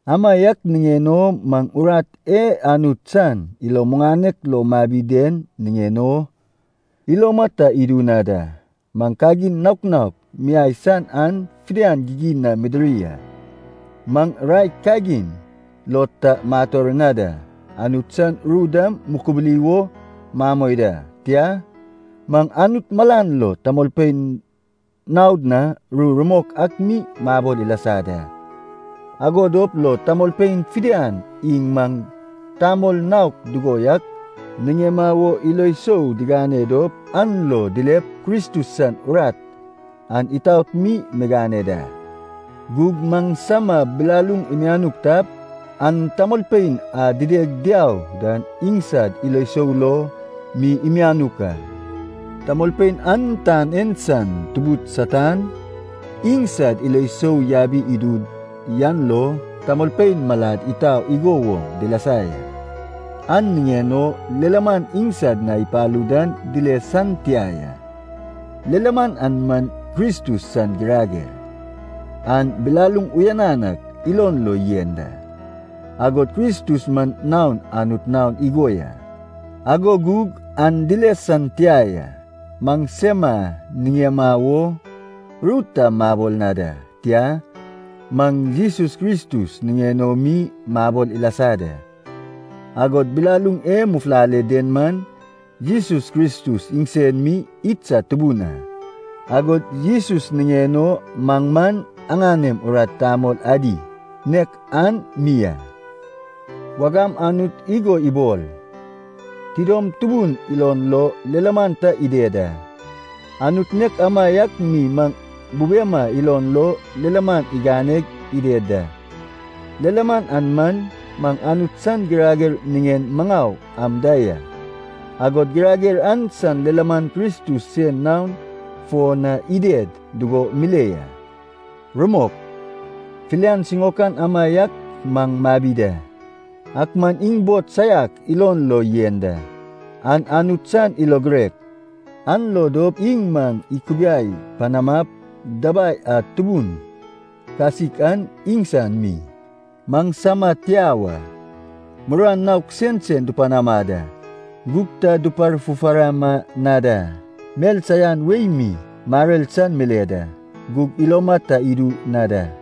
Amaiak niŋen o maŋ urat e Anut san ilo muŋanek lo mabi den niŋen o, iloma ta idu na da. Maŋ kagin naok naok miai san an fidian gigin na midiri a. Maŋ raek kagin lo ta mator na da. Anut san ru dam mukubuli wo mamoi da. Tia, maŋ Anut malan lo tamolpein naod na ru rumok ak mi mabol ilasa da. Ago dop lo tamolpein fidian iŋ maŋ tamol naok dugo yak niŋema wo ilo sou digane dop an lo dilep Kristus san urat an itaot mi migane da. Gug maŋsama bilaluŋ imianuk tap, an tamolpein a dideg diau dan iŋsad ilo sou lo mi imianuk a. Tamolpein an tan en san tubud Satan, iŋsad ilo sou yabi idu yan lo, tamol malad itau igo woŋ dilasa ya. An niŋen o lilaman iŋsad na ipalu dan dile san tia ya. Lilaman an man Kristus san girager, an bilaluŋ uyanan ak ilon lo yen da. Agod Kristus man naon Anut naon igo ya, ago gug an dile san tia ya. Maŋsema niŋema wo ru ta mabol na da, tia, maŋ Jesus Kristus niŋen o mi mabol ilasa da. Agod bilaluŋ e mufulale den man, Jesus Kristus iŋsen mi idsad Tubun a. Agod Jesus niŋen o maŋ man aŋanem urat tamol adi, nek an mi a. Wagam Anut igo ibol, “Tidom tubun ilon lo lilaman ta ided a.” Anut nek amaiak mi maŋ bubema ilon lo lilaman iganeg ided da. Lilaman an man, maŋ Anut san girager niŋen maŋau am da ya. Agod girager an san lilaman Kristus sen naon fo na ided dugo mile ya. Rumok, filian siŋaokan amaiak maŋ mabi da, ak man iŋ bod saiak ilon lo yen da. An Anut san ilo girek, an lo dop iŋ maŋ ikubiai panamap, dabai a tubun kasik an iŋsan mi, maŋsama tia wa. Muruan naok sensen dupanama da, gug ta duparfufarama na da. Mel saian wei mi marer san mile da, gug iloma ta idu na da.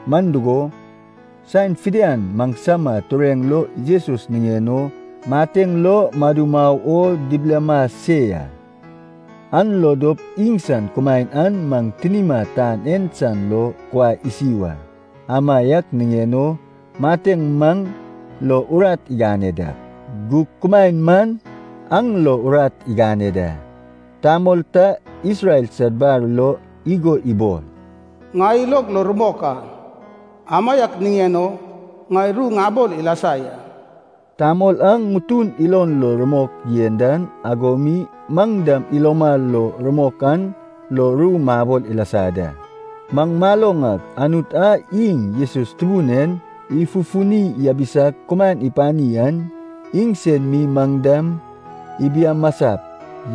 Man dugo, saen fidian maŋsama tureŋ lo Jesus niŋen o mateŋ lo madu mau o dibilama se ya, an lo dop iŋsan kumaen an maŋ tinima tan en san lo kuai isi wa. Amaiak niŋen o, mateŋ maŋ lo urat igane dak, gug kumaen man aŋ lo urat igane da. Tamol ta Isrel sad bar lo igo ibol, “Ŋai ilog lo rumok a. Amaiak niŋen o ŋai ru ŋabol ilasa ya.” Tamol a ŋutun lo ilo rumok yen dan ago mi maŋ dam iloma lo rumok an lo ru mabol ilasa ya. Maŋ maloŋ ak Anut a iŋ Jesus Tubun en ifufuni yabisag kumaen ipani an, iŋsen mi maŋ dam ibiamasap,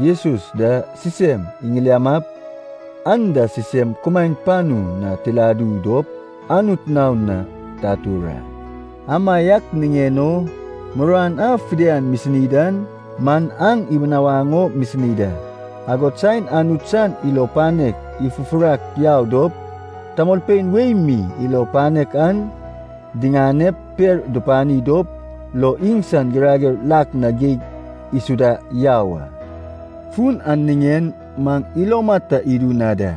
Jesus da sisem iŋiliamap, aŋ da sisem kumaen panu na tiladu dop, Anut naon na tatur a. Amaiak niŋen o muruan a fidian misini dan man aŋ ibinawaŋ o misini da. Agod saen Anut san ilo panek ifufurak yau dop tamolpein wei mi ilo panek an diŋanep per dupani dop lo iŋsan girager lak na geig isuda yau a. Fun an niŋen maŋ iloma ta idu na da.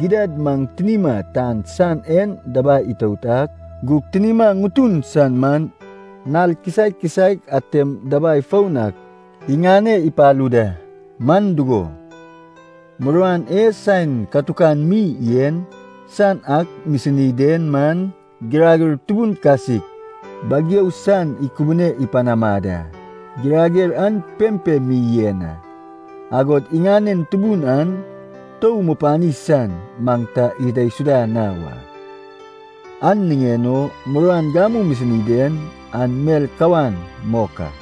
Gidad maŋ tinima tan san en dabai itout ak, gug tinima ŋutun san man nal kisaek kisaek atem dabai foun ak iŋane ipalu da. Man dugo, muruan e saen katukan mi yen san ak misini den man, girager tubun kasik bageu san ikubune panama da. Girager an pempem mi yen a, agod iŋanen tubun an tou mupani san maŋ ta idaisuda na wa. An niŋen o muruan gamu misini den an mel kawan mok a.